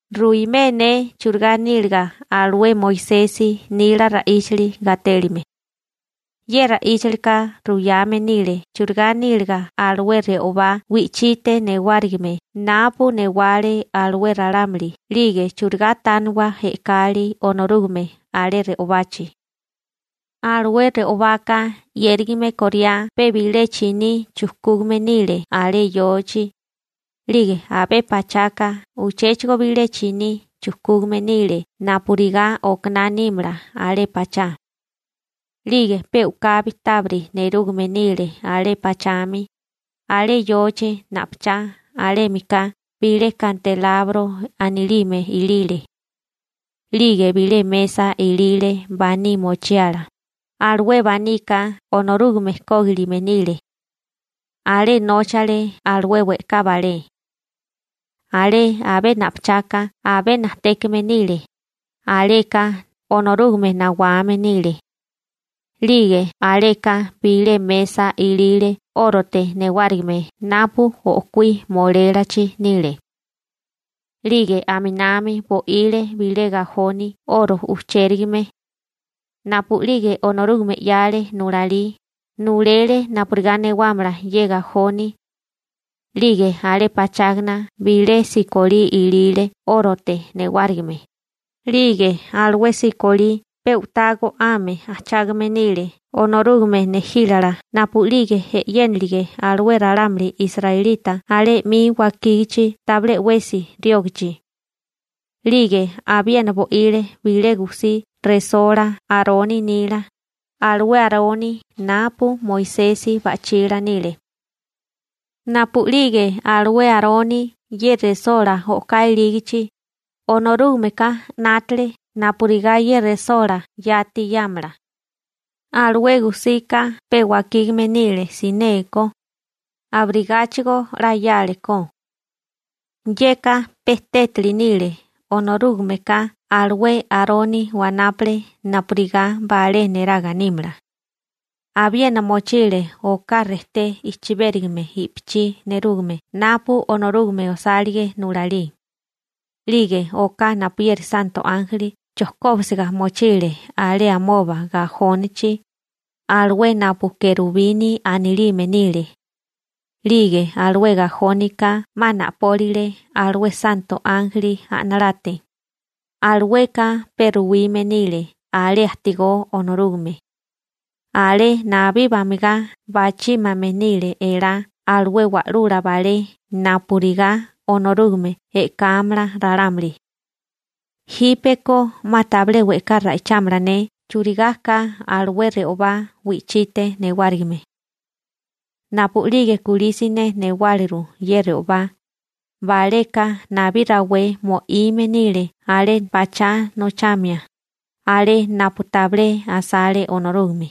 Ruimé ne churigá níliga alué Moisesi nila ra'íchali gatélime. Ye ra'íchali ka ruyame nile churigá níliga alué re'obá wi'chite newárigime napu newale alué ralámuli 'lige churigá tániwa e'kali Onorúgame alé re'obachi. Alué re'obaka 'yérigame koriá pe bilé chiní chujkúgame nile alé yochi, 'lige abé pachaka uchéchigo bilé chiní chujkúgame nile napurigá okaná nímala alé pachá. 'Lige pe u'kabi tábiri nerúgame nile alé pachami, alé yochi na'pachá alémika bilé kantelabro anilime ilile. 'Lige bilé mesa ilile baní mochíala, alué banika Onorúgame kógilime nile. Alé nóchale alué we'ká balé. Alé abé 'na pacháká abé najtékame nile, aléká Onorúgame nawame nile. 'Lige aléká bilé mesa ilile 'órote newárigime napu o'kuí molélachi nile. 'Lige aminami bo'ile bilé gajoni 'oro ujchérigame. Napu'lige Onorúgame 'yale nulalí, nulele napurigá newámala ye gajoni. 'Lige alé pachágana bilé sikolí ilile 'órote newárigime, 'lige alué sikolí pe u'tá go'ame ajchágame nile Onorúgame nejílala napu'lige e'yénilige alué ralámuli israelita alé 'mi wakígachi tabilé 'wesi riógachi. (Maná anilime nile alué go'ame.) 'Lige abiena bo'ile bilé gujsí resola Aroni nila, alué Aroni napu Moisesi ba'chila nile. Napu'lige alué Aroni ye resola o'ká ilígichi, Onorúgameka 'nátale napurigá ye resola yati 'yámala. Alué gujsika pe wakígame nile sineko, abirigáchigo 'la yáleko. (Yeka pe tétali nile Onorúgameka alué Aroni wanápale napurigá balé neraga nímala.) Abiena mochile oká rejté i'chibérigime i'pichí nerúgame napu Onorúgame osálige nulalí. 'Lige oká napuyeri santo ánjeli chojkóbisiga mochile alé amoba gajónichi, alué napu Kerubini anilime nile. 'Lige alué gajónika 'ma na'pólile alué santo ánjeli a'nalate. Alueka pe ruwime nile alé ajtigó Onorúgame. Alé nabí bamigá ba'chímame nile elá alué wa'lula balé napurigá Onorúgame e'kámala ralámuli. Jípeko 'ma tabilé we'ká ra'ichámala ne churigá ka alué re'obá wi'chite newárigime. Napu'lige kulí siné newáleru ye re'obá, baleka nabí rawé mo'ime nile alé pachá nochamia, alé napu tabilé asale Onorúgame.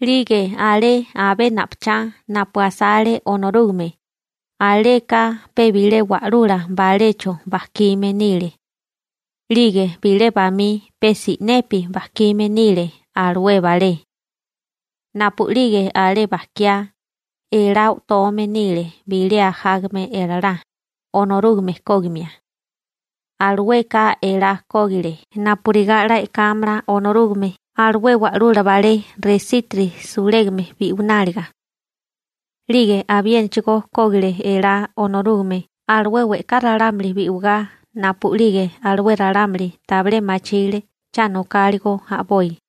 'Lige alé abé na'pachá napu asale Onorúgame, aleka pe bilé wa'lula balecho bajkime nile. 'Lige bilé bamí pe si'nepi bajkime nile alué balé. Napu'lige alé bajkiá, elá o'tome nile bilé ajágame elalá, Onorúgame kógimia. Alueka elá kógile napurigá 'la e'kámala Onorúgame alué wa'lula balé resítiri sulégame bi'wináliga. 'Lige abiénachigó kógile elá Onorúgame alué we'ká ralámuli bi'wigá napu'lige alué ralámuli tabilé machile cha nokáligo a'boi.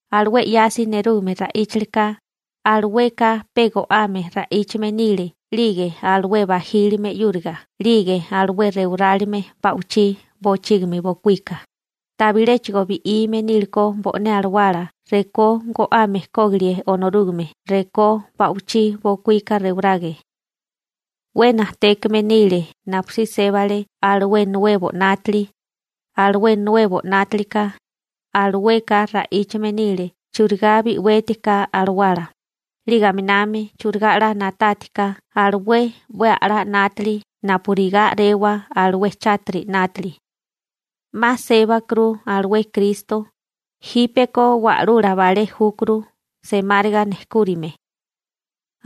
Alué 'yasi nerúgame ra'íchalika, alueka pe go'ame ra'íchame nile 'lige alué bajílime 'yúriga 'lige alué rewarálime ba'wichí bochígimi bokuíka. Tabiléchigo bi'ime níliko bo'né alawala rekó go'ame kógilie Onorúgame rekó ba'wichí bokuíka rewarage. 'We najtékame nile napusí sébale alué nuebo 'nátili. Alué nuebo 'nátilika, alueka ra'íchame nile churigá bi'wétiká alawala, 'lige aminami churigá 'la na'tátiká alué 'we a'lá 'nátili napurigá a'rewa alué chátiri 'nátili. 'Ma sébakuru alué Kristo, jípeko wa'lula balé júkuru semáriga nejkúrime.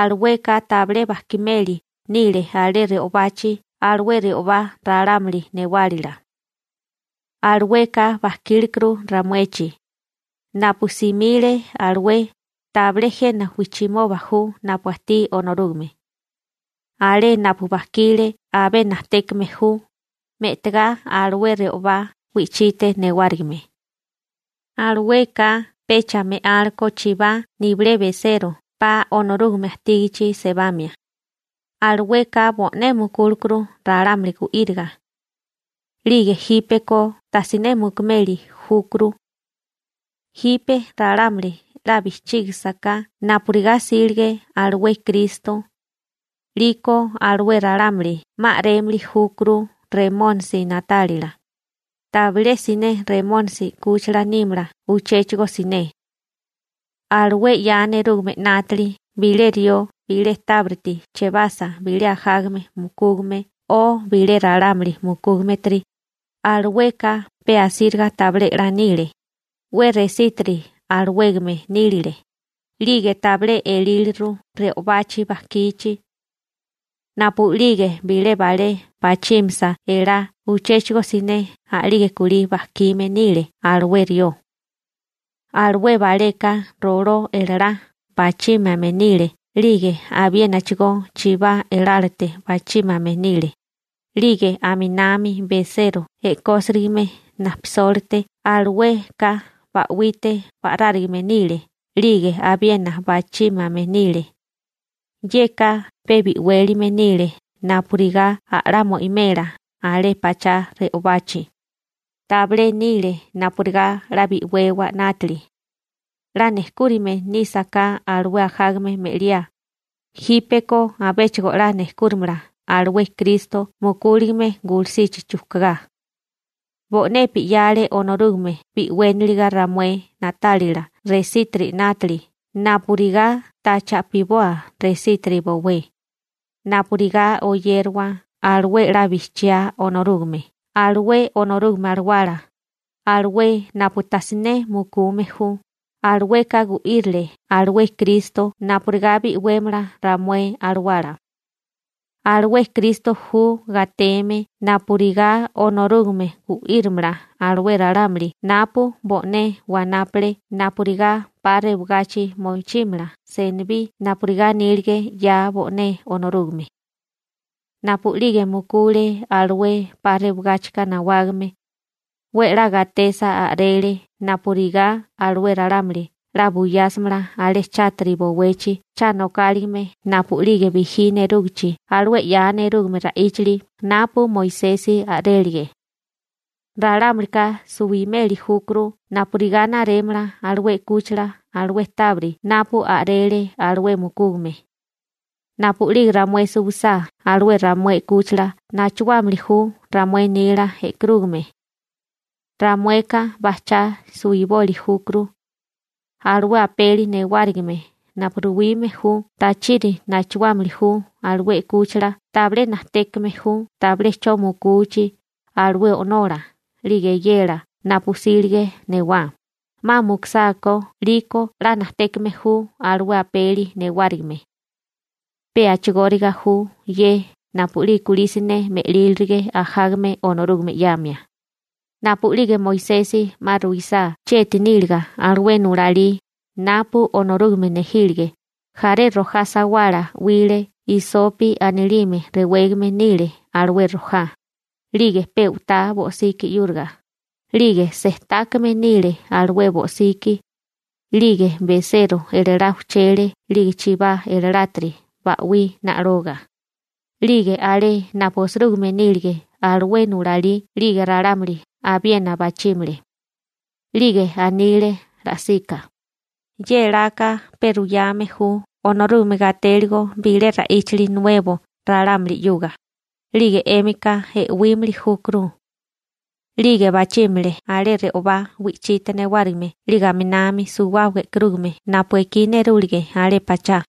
Alueka tabilé bajkimeli nile alé re'obachi alué re'obá ralámuli newálila. Alueka bajkílekuru ramuechi. Napu simile alué, tabilé jena wijchimoba ju napu ajtí Onorúgame. Alé napu bajkile abé najtékame ju, me'tigá alué re'obá wi'chite newárigime. Alueka pecha me'áleko chibá nibilé besero 'pa Onorúgame ajtígichi sebamia. Alueka bo'né mukúlekuru ralámuli gu'íriga. 'Lige jípeko tajsiné mukumeli júkuru. Jipe ralámuli 'la bijchígisaká napurigá 'sílige alué Kristo, 'liko alué ralámuli 'ma a'rémili júkuru Remónisi na'tálila. Tabilé siné Remónisi 'kúchila nímala uchéchigo siné. Alué 'ya nerúgame 'nátili bilé rió bilé tábiriti chébasa bilé ajágame mukúgame o bilé ralámuli mukúgametiri, alueka pe asíriga tabilé 'la nile, 'we resítiri alawégame nílile, 'lige tabilé elíliru re'obachi bajkichi. Napu'lige bilé balé bachímasa elá uchéchigo siné a'lige kulí bajkime nile alué rió. Alué baleka roló elalá bachímame nile 'lige abiénachigó chibá elalate bachímame nile, 'lige aminami besero e'kósirigame najpisólate, alueka ba'wite ba'rárigame nile, 'lige abiena bachímame nile. Yeka pe bi'wélime nile napurigá a'lá mo'imela alé pachá re'obachi. Tabilé nile napurigá 'la bi'wewa 'nátili. 'La nejkúrime nísaká alué ajágame me'liá, jípeko abéchigo 'la nejkúrimala alué Kristo mukúligame gulusichi chujkugá. ¡Bo'nepi 'yale Onorúgame bi'wéniliga ramué na'tálila resítiri 'nátili napurigá ta cha'piboa resítiri bowé, napurigá oyérawa alué 'la bijchiá Onorúgame! Alué Onorúgame Alawala, alué napu tasiné mukume ju, alueka gu'írile alué Kristo napurigá bi'wémala ramué alawala. Alué Kristo ju gateme napurigá Onorúgame gu'írimala alué ralámuli napu bo'né wanápale napurigá 'pa rewagachi mochímala senibí napurigá anílige 'ya bo'né Onorúgame. Napu'lige mukule alué 'pa rewigáchika nawágame, 'we 'la gatesa a'rele napurigá alué ralámuli 'la buyásimala alé chátiri bowechi cha nokáligame napu'lige bijí nerúgichi alué 'ya nerúgame ra'íchali napu Moisesi a'rélige. Ralámulika suwimeli júkuru napurigá narémala alué 'kúchila alué tábiri napu a'rele alué mukúgame. Napu'lige ramué suwisá alué ramué 'kúchila nachuámili ju ramué nila e'karúgame. Ramueka bajchá suwiboli júkuru. Alué apeli newárigime napu ruwime ju tachiri nachuwámili ju alué 'kúchila tabilé najtékame ju tabilé 'cho mukuchi alué o'nola 'lige eyela napu jsílige newá, 'ma mukusá ko 'liko 'la najtékame ju alué apeli newárigime. Pe a'chigóriga ju ye napu'lige kulí siné me'lílirige ajágame Onorúgame 'yamia. Napu'lige Moisesi 'ma ruisá chieti níliga alué nulalí napu Onorúgame nejílige, jaré rojá sawala 'wile isopi anilime rewégame nile alué rojá, 'lige pe u'tá bo'siki 'yúriga, 'lige sejtákame nile alué bo'siki, 'lige besero elalá ujchele 'lige chibá elalátiri ba'wí na'loga, 'lige alé napu osirúgime nílige alué nulalí 'lige ralámuli abiena bachímale. 'Lige anile la'sika: «Ye elaka pe ruyame ju Onorúgame gatéligo bilé ra'íchali nuebo ralámuli 'yuga, 'lige 'émika e'wímili júkuru.» 'Lige bachímale alé re'obá wi'chite newárigime 'lige aminami suwábaga e'karúgame napu ekí nerúlige alé pachá.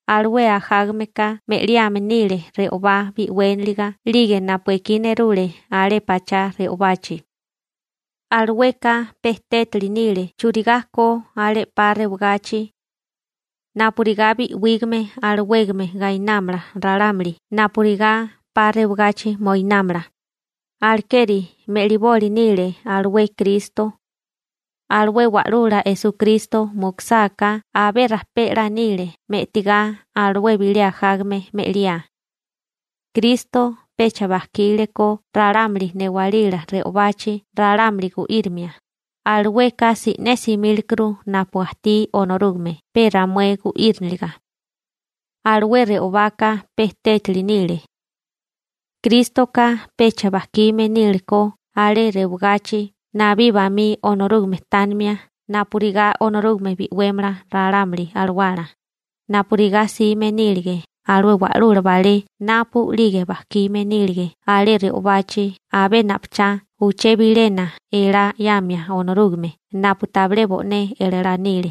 Alué ajágame ka me'liame nile re'obá bi'wéniliga 'lige napu ekí nerule alé pachá re'obachi. Alueka pe tétali nile churigá ko alé 'pa rewagachi. Napurigá bi'wígame alawégame gainámala ralámuli napurigá 'pa rewagachi mo'inámala, alekeri me'liboli nile alué Kristo. Alué Wa'lula Esukristo mukusáká abé rajpé 'la nile me'tigá alué bilé ajágame me'liá. Kristo pecha bajkile ko ralámuli newalila re'obachi ralámuli gu'írimia, alueka si'né simílekuru napu ajtí Onorúgame pe ramué gu'íriniliga. Alué re'obaka pe tétali nile. Krístoka pecha bajkime níliko alé rewagachi nabí bamí Onorúgame tánimia napurigá Onorúgame bi'wémala ralámuli alawala, napurigá 'sime nílige alué wa'lula balé napu'lige bajkime nílige alé re'obachi abé na'pachá uché bilena elá 'yamia Onorúgame napu tabilé bo'né elalá nile,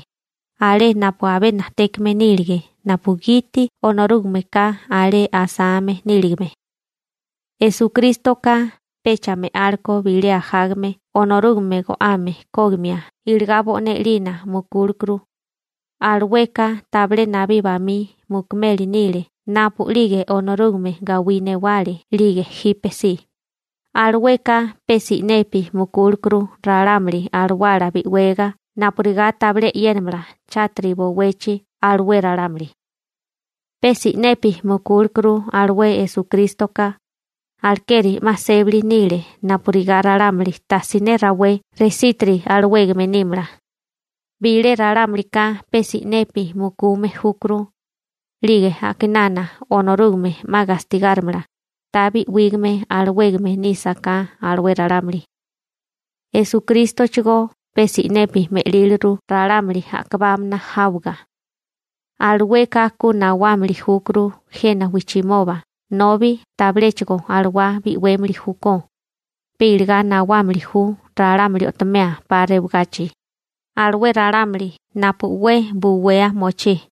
alé napu abé najtékame nílige napugiti Onorúgameka alé asame níligame. Esukrístoka pecha me'áleko bilé ajágame Onorúgame go'ame kógimia iligá bo'né 'lina mukúlekuru. Alueka tabilé nabí bamí mukumeli nile napu'lige Onorúgame gawí newale 'lige jipe si, alueka pe si'nepi mukúlekuru ralámuli alawala bi'wega napurigá tabilé e'yénamala chátiri bowechi alué ralámuli. Pe si'nepi mukúlekuru alué Esukrístoka, alekeri 'ma sébali nile napurigá ralámuli tasiné rawé resítiri alawégame nímala. Bilé ralámulika pe si'nepi mukume júkuru, 'lige a'kinana Onorúgame 'ma gastigárimala, ta bi'wígame alawégame nísaká alué ralámuli. Esukrístochigó pe si'nepi me'líliru ralámuli a'kabámana jáwaga. Alueka ku nawámili júkuru jena wijchimoba nobi tabiléchigo alawá bi'wémili júkó, pe iligá nawámili ju ralámuli o'tomea 'pa rewagachi, alué ralámuli napu 'we buwea mochí.